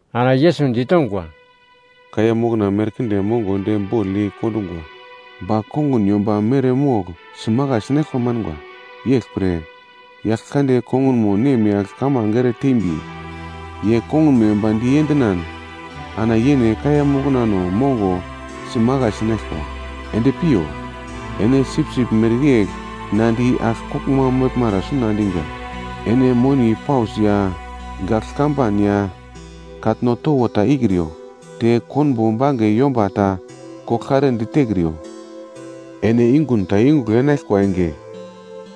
Ana Yesus ditongwa, “Kaiya mokna merkinde mongo de bogl yei kondungwa, ba kongun yomba mere mogl simakai sinaglkwa manga. Yeglpre, Yaglkande kongun nemyagl kamange ere teimbi, ye kongunmo yomba di endinan ana yene kaiya moknamo mongo simakai sinaglkwa. Ende piyo! Ene sipsip mereyegl na di agl koglma meglmara suna endiga. Ene moni paus ya gagl kamban ya katno towo ta ikriyo, te konbo bange yomba ta koglkare ditekriyo. “Ene yungu ta yungugl enaglkwa enge,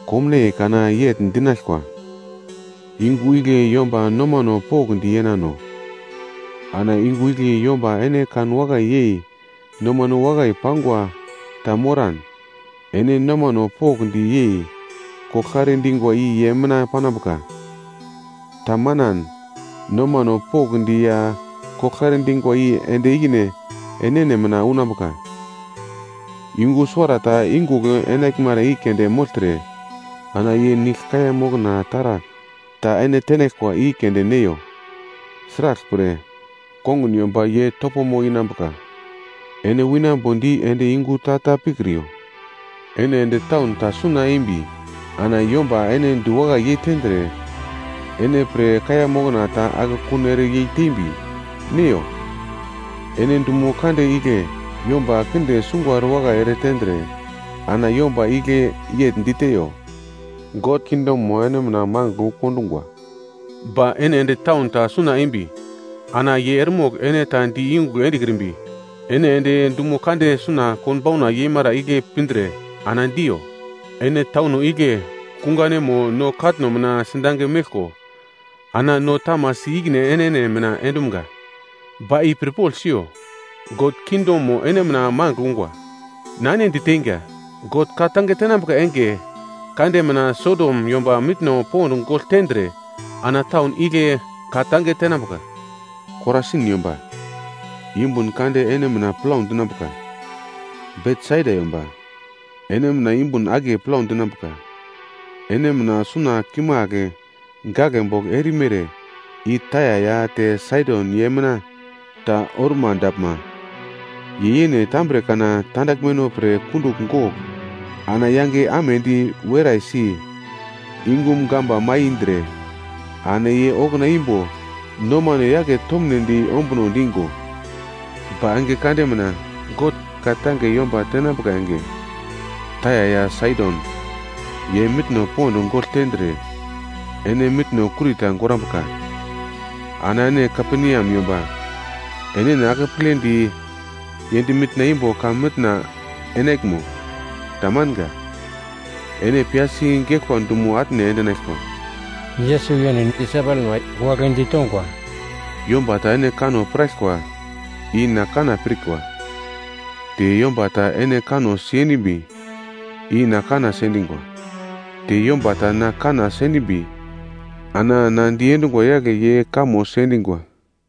komnaiye kana yegl dinaglkwa. Yungu igle yomba nomano pokndi yenano. Ana yungu igle yomba ene kanwakai yei nomane wakai pangwa ta moran, ene nomano pokndi yei koglkare dingwa i ye mina panambuka. Ta manan, nomano pokndi ya koglkare dingwa i ende ikine enene mina unambuka. Yungu suwarata yungugl enaglmara i keunde mogltre, ana ye nigl kaiya mokna taragl ta ene tenaglkwa i keunde neiyo, sraglpre kongun yomba ye topomo inambuka, ene winambo di ende yungu ta ta pikriyo. “Ene ende taun ta suna eimbi ana yomba ene diwakai yeitendre, ene pre kaiya mokna ta akekun ere yei tembi neiyo. Ene dumo kande igle yomba kinde sungwa erewakai ere tendre, ana yomba igle yegl diteiyo, ‘God kingdomo ene mina mangigl wu kondungwa.’ Ba ene ende taun ta suna eimbi, ana ye eremogl ene ta di yungugl endekrimbi, ene ende dumo kande suna konbauna yeimara igle pindre ana diyo. Ene tauno igle kunganemo no katno mina sidange meglko, ana no tamasi ikine enene mina endumga. Ba i pirpogl siyo, God kingdomo ene mina mangigl ungwa. Na ene diteinga, God ka-tange tenambuka enge kande mina Sodom yomba mitno pond gogl tendre ana taun igle ka-tange tenambuka. “Korasin yomba, yumbun kande ene mina plau dinambuka. Betsaida yomba, ene mina yumbun akiye plau dinambuka. Ene mina suna kimagl gaglebogl erimere i Taia ya te Saidon ye mina ta oruma daglma, ye yene tambre kana tandaglmeno pre kundugl gogl ana yange amedi weraisi, yungum gamba mai indre, ana ye okuna imbo nomano yake tomnedi ombuno digo. Ba enge kande mina God ka-tange yomba tenambuka enge, Taia ya Saidon ye mitno pond gogl tendre, ene mitno kurita gorambuka. Ana ene Kaperneam yomba enene akepledi yend mitna imbo heven enaglmo? Tamanga, ene piyasi geglkwa dumo atne endinaglkwa.” Yesus yene disaipelma wagle ditongwa, “Yomba ta ene kanno piraglkwa, i na kanna pirkwa, te yomba ta ene kanno sendimbi, i na kanna sendingwa. Te yomba ta na kanna sendimbi, ana na diendungwa yagle ye kamo sendingwa.”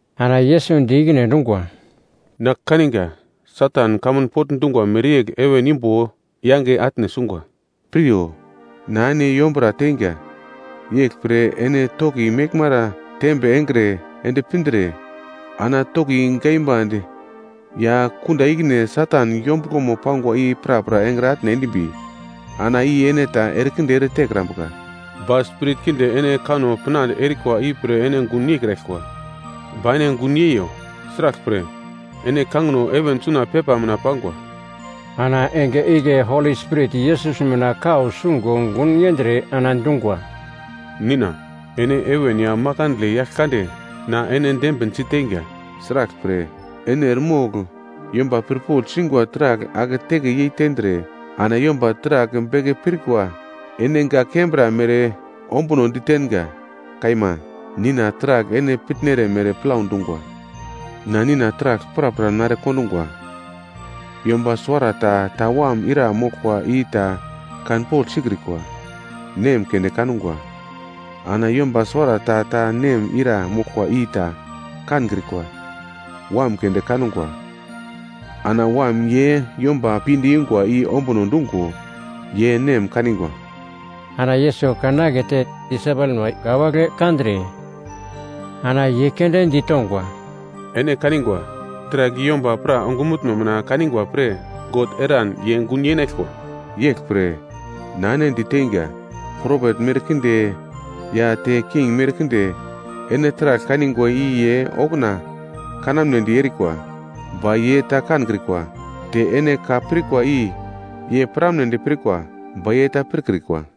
Ana Yesus di ikine endungwa, “Na kaninga Satan kamun pogl dungwa mereyegl heven imbo yange atne sungwa. Piryo, na ene yombura teinga, yeglpre ene toki meglmara tembe engre ende pindre, ana toki gaimbande ya kunda ikine Satan yombuglomo pangwa i prapra engre atne endimbi ana i ene ta erekinde ere tekrambuka. Ba spirit kinde ene kanno pinande erikwa ipre ene gun yeikraglkwa. Ba ene gun yeiyo; sraglpre, ene kangino heven suna pepa mina pangwa.” Ana enge igle Holi Spirit Yesus mina kau sungo gun yendre ana dungwa, “Nina, ene heven ya makandle, Yaglkande. Na ene dembinsi teiga. Sraglpre, ene eremogl yomba pirpogl singwa taragl aketeke yei tendre ana yomba taragl beke pirkrikwa ene gak kembra mere ombuno ditenga. Kaima, Nina, taragl ene pitnere mere plau dungwa. “Na Nina taragl prapra nare kondungwa, yomba suwarata ta Wam ira moglkwa i ta kanpogl sikrikwa. Nem keunde kangwa, ana yomba suwarata ta nem ira moglkwa i ta kankrikwa. Wam keunde kangwa, ana Wam ye yomba pinde yungwa i ombuno dungo ye Nem kanigwa.” Ana Yesus kan akete disaipelma wagle kandre, ana ye keunde ditongwa, “Ene kanigwa, taragl i yomba pra ongumutno mina kanigwa pre God eran ye gun yenaglkwa. Yeglpre na ene diteinga, propet merkinde ya te king merkinde ene taragl kanigwa i ye okuna kanamnedi erikwa, ba ye ta kankrikwa. Te ene ka pirkwa i ye piramnedi pirkwa, ba ye ta pirkrikwa.”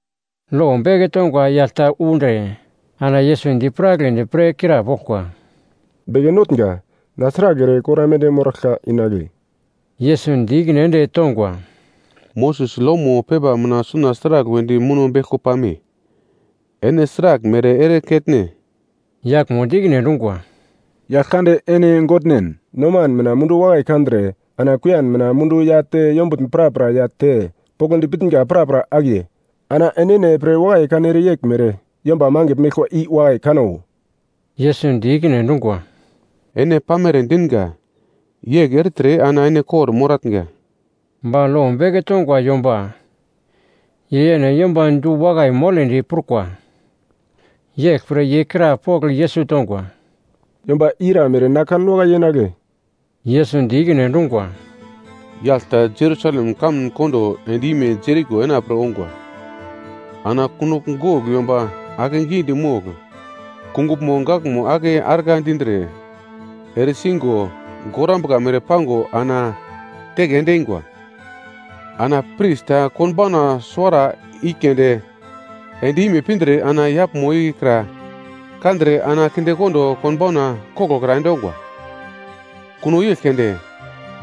Lo beke tongwa yagl ta undre ana Yesus dipiragledi pre krapoglkwa, “Beke Notnga, na sragl ere kor aimande moraglka inagle?” Yesus di ikine ende tongwa, “Moses lomo pepa mina suna sragl wedi muno beglko pame? Ene sraglmere ere ketne?” Yaglmo di ikine endungwa, “Yaglkande ene Godnen, noman mina mundu wakai kandre, ana kuiyan mina mundu ya te yombutn prapra ya te, poglodi pitnga prapra akiye. Ana enene pre wakai kanere yeglmere, yomba mangigl meglkwa i wakai kano.” Yesus di ikine endungwa, “Ene pamere dinga, yegl ertre ana ene kor-moratnga.” Ba lo beke tongwa yomba ye yene yomba du-wakai moledi prukwa, yeglpre ye krapogl Yesus tongwa, “Yomba i ira mere na kanwakai yenagle?” Yesus di ikine endungwa, “Yagl ta Jerusalem kamun kondo end-ime Jeriko enapre ongwa, ana kunogl gogl yomba ake gidi mogl, kunguglmo gaglmo ake argla dindre, ere singo gorambuka mere pango ana teke ende eingwa. Ana pris ta konbauna suwara i keunde end-ime pindre ana yaglmo ikra kandre ana kindekondo konbauna koglokra endongwa. Kuno yegl keunde,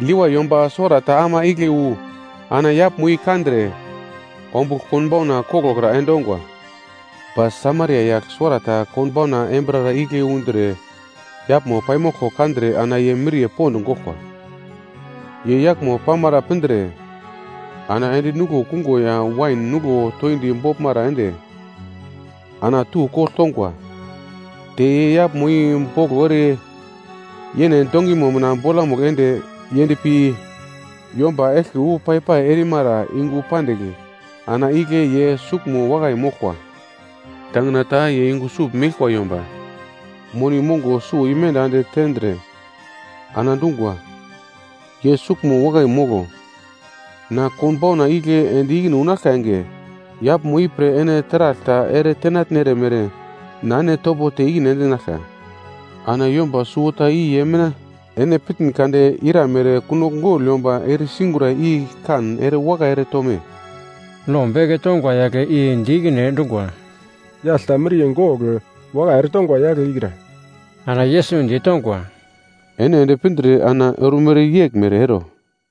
Levai yomba suwarata ama igle wu ana yaglmo i kandre, ombugl konbauna koglokra endongwa. Ba Samaria yagl suwarata konbauna embirara igle undre yaglmo paimoglko kandre ana ye miriye pond goglkwa. Ye yaglmo pamara pindre ana ende nuglo kungo ya wain nuglo toindi boglmara ende, ana tu kogl tongwa. Te ye yaglmo i boglo ere yene dongimo mina bolamugl ende yendpi yomba eglke wu pai-pai erimara yungu pandigl ana igle ye suglmo wakai moglkwa. Tangina ta ye yungu sugl meglkwa yomba moni mongo suwo i menda ende tendre, ana dungwa, ‘Ye suglmo wakai molo. Na konbauna igle ende ikine unaglka enge, yaglmo ipre ene taragl ta ere tenatnere mere na ene topo te ikine endinaglka.’ “Ana yomba suwota i ye mina ene pitn kade iramere kunogl gogl yomba eresigura i kan ere wakai ere tome?” Lo beke tongwa yagle i di ikine endungwa, “Yagl ta miriye gogl wakai ere tongwa yagle ikra.” Ana Yesus ditongwa, “Ene ende pindre ana ormere yeglmere ero.”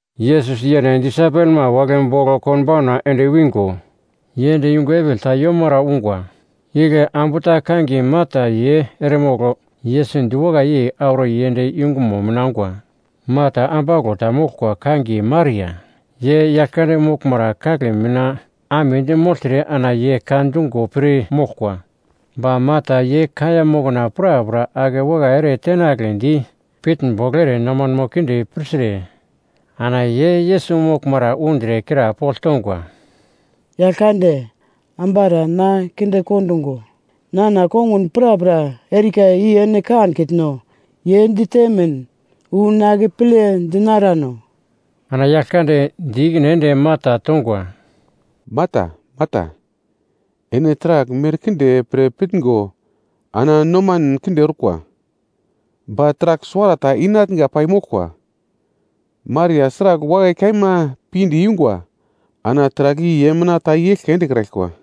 Yesus yene disaipelma wagle bogl konbauna ende wingo, ye ende yungu epigl ta yomara ungwa, igle ambu ta kangiye Marta, ye eremogl Yesus diwakai yei auro yend yungumo mina ongwa. Marta ambauglo ta moglkwa kangiye Maria, ye Yaglkande moglmara kagle mina amedi mogltre ana ye ka dungo pir moglkwa. Ba Marta ye kaiya mokna prapra ake wakai ere tenagledi pitnbogl ere nomano kinde pirtre ana ye Yesus moglmara undre krapogl tongwa, “Yaglkande, ambara na kinde kondungo, nana kongun prapra erika i ene kankitno? Ye ditemin wu na akeple dinarano.” Ana Yaglkande di ikine ende Marta tongwa, “Marta, Marta, ene taragl merkinde pre pitngo ana nomanen kinde orkwa ba taragl suwarata inatnga pai moglkwa. Maria sragl wakai kaima pinde yungwa ana taragl i ye mina ta i eglke endekraglkwa.”